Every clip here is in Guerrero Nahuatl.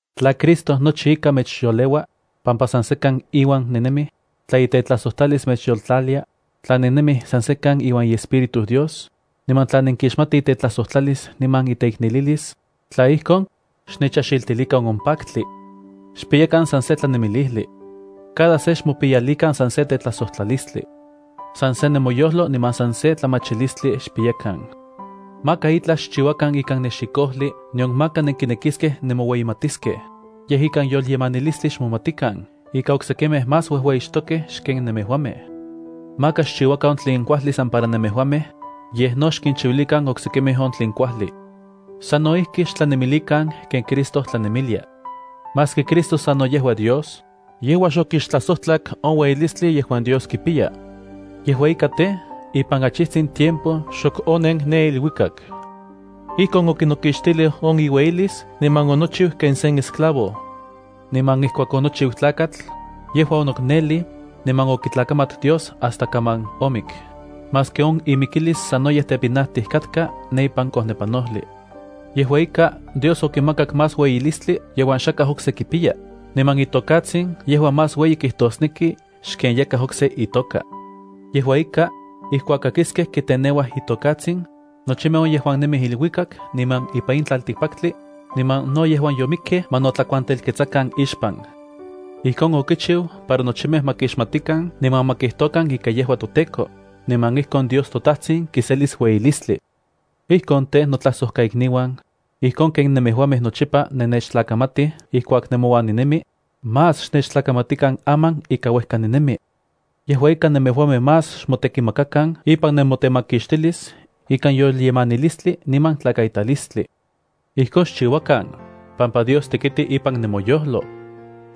Tla Cristo nochi ika mechyoleua, pampa san sekan iuan nennemij, tla itetlajsojtlalis mechyoltlalia, tla nennemij san sekan iuan iEspíritu Dios, niman tla nenkixmatij itetlajsojtlalis niman iteiknelilis, tla ijkon, xnechajxiltilikan on paktli. Xpiyakan san se tlanemilijli. Cada se xmopiyalikan san se tetlajsojtlalistli. San se nemoyojlo niman san se tlamachilistli xpiyakan. Maka itlaj xchiuakan ikan nexikojli nion maka nenkinekiskej nemoueyimatiskej, yej ikan yolyemanilistli xmomatikan ika oksekimej más uejueyixtokej xken nemejuamej. Maka xchiuakan on tlen kuajli san para nemejuamej, yej no xkinchiuilikan oksekimej on tlen kuajli. Sano ijki xtlanemilikan ken Cristo tlanemilia. Maski Cristo sano yejua Dios, yejua xokixtlajsojtlak on ueyilistli yejuan Dios kipiya. Yejua ika tej, ipan achitsin tiempo xok onen ken Dios nemi. Ijkon okinokixtilij on iueyilis niman onochiu ken sen esclavo. Niman ijkuak onochiu tlakatl, yejua onoknonelij, niman okitlakamat Dios hasta kaman omik, maski on imikilis sanoyej tepinajtij katka ne ipan kojnepanojli. Yejua ika, Dios okimakak más ueyilistli yejuan xakaj okse kipiya, niman itokatsin yejua más ueyi kijtosneki xken yakaj okse kipiya itoka. Yejua ika, ijkuak kakiskej kiteneuaj iTokatsin, nochimej on yejuan nemij iluikak niman ipan in tlaltikpaktli, niman no yejuan yomikkej, ma notlakuantelketsakan ixpan. Ijkon okichiu para nochimej ma kixmatikan niman ma kijtokan ika yejua toTEKO, niman ijkon Dios toTajtsin kiselis ueyilistli. Ijkon tej, notlajsojkaikniuan, ijkon ken nemejuamej nochipa nennechtlakamatij ijkuak nemouan ninemi, más xnechtlakamatikan aman ika uejka ninemi. Aman tej, nemejuamej más xmotekimakakan ipan nemotemakixtilis ikan yolyemanilistli niman tlakaitalistli. Ijkon xchiuakan, pampa Dios tekiti ipan nemoyojlo.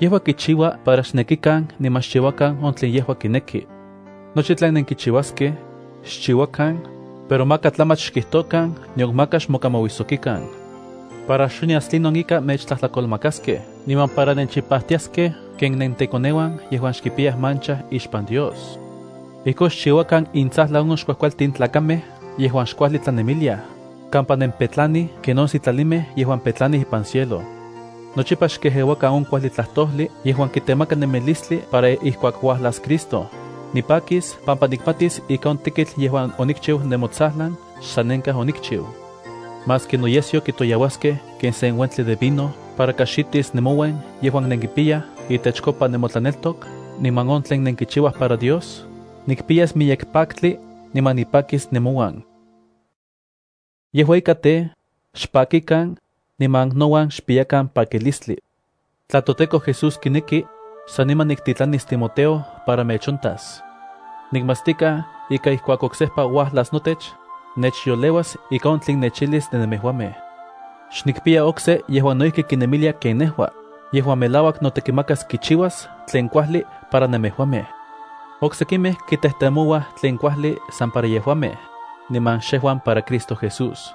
Yejua kichiua para xnekikan niman xchiuakan on tlen yejua kineki. Nochi tlen nenkichiuaskej, xchiuakan, pero maka tlamach xkijtokan nion maka xmokamauijsokikan, para xonyas tlinon ika mechtlajtlakolmakaskej niman para nenchipajtiaskej ken nentekoneuan yejuan xkipiyaj mancha ixpan Dios. Ijkon xchiuakan intsajlan on xkuajkualtin tlakamej yejuan xkuajli tlanemiliaj, kampa nempetlanij ken on sitlalimej yejuan petlanij ipan cielo. Nochipa xkejeuakan on kuajli tlajtojli yejuan kitemaka nemilistli para ijkuak uajlas Cristo, nipakis pampa nikmatis ika on tekitl yejuan onikchiu nemotsajlan xsanenkaj onikchiu. Maski noyesyo kitoyauaskej ken sen uentli de vino para kajxitis nemouen yejuan nenkipiyaj itechkopa nemotlaneltok niman on tlen nenkichiuaj para Dios, nikpiyas miyek paktli niman nipakis nenmouan. Yejua ika tej, xpakikan, niman nouan xpiyakan pakilistli. Tla toTEKO Jesús kineki, saniman niktitlanis Timoteo para mechontas. Nikmatstikaj ika ijkuak oksejpa uajlas notech, nechyoleuas ika on tlen nechijlis de nemejuamej. Xnikpiya okse yejuan no ijki kinemilia ken nejua, yejuan melauak notekimakas kichiuas tlen kuajli para nemejuamej. Oksekimej kitejtemouaj tlen kuajli san para yejuamej, niman xejuan para Cristo Jesús.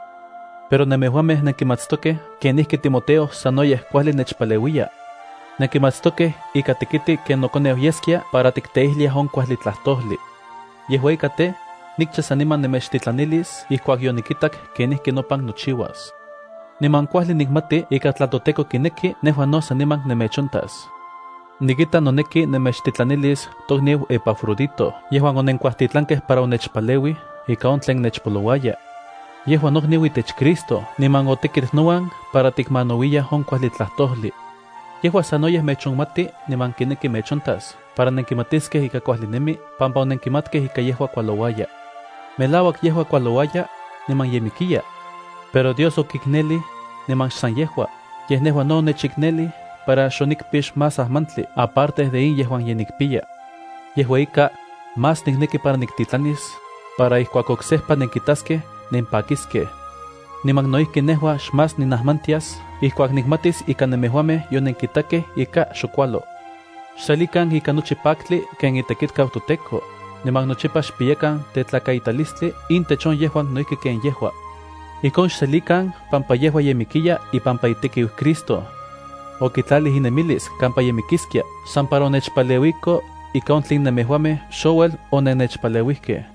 Pero nemejuamej nenkimatstokej ika Timoteo sanoyej kuajli nechpaleuiya. Nenkimatstokej kenijki otekit ken nokoneu yeskia para tikteijliaj on kuajli tlajtojli. Yejua ika tej, nikcha saniman nemechtitlanilis ijkuak yonikitak kenijki nopan nochiuas. Niman kuajli nikmati ika tla toTEKO kineki, nejua no saniman nemechontas. Nikita noneki nemechtitlanilis tokniu Epafrodito yejuan onenkuajtitlankej para onechpaleuij ika on tlen nechpolouayaj. Yejua nokniu itech Cristo niman otekit nouan para tikmanauiyaj on kuajli tlajtojli. Yejua sanoyej mechonmati niman kineki mechontas para nenkimatiskej ika kuajli nemi pampa onenkimatkej ika yejua kualouaya. Melauak yejua kualouaya, niman ye mikiya. Pero Dios okiknelij, niman xsan yejua, yej nejua no onechiknelij para xonikpix más ajmantli aparte de in yejuan ye nikpiya. Yejua ika, más nikneki para niktitlanis, para ijkuak oksejpa nenkitaskej nempakiskej. Niman no ijki nejua xmás ninajmantias ijkuak nikmatis ika nemejuamej yonenkitakej ika xok kualo. Xselikan ikan nochi paktli ken itekitkau toTEKO, niman nochipa xpiyakan tetlakaitalistli intech on yejuan no ijki ken yejua. Ijkon xselikan pampa yejua ye mikiya ipampa itekiu Cristo. Okitlalij inemilis kampa ye mikiskia san para onechpaleuiko ika on tlen nemejuamej xouel onennechpaleuijkej.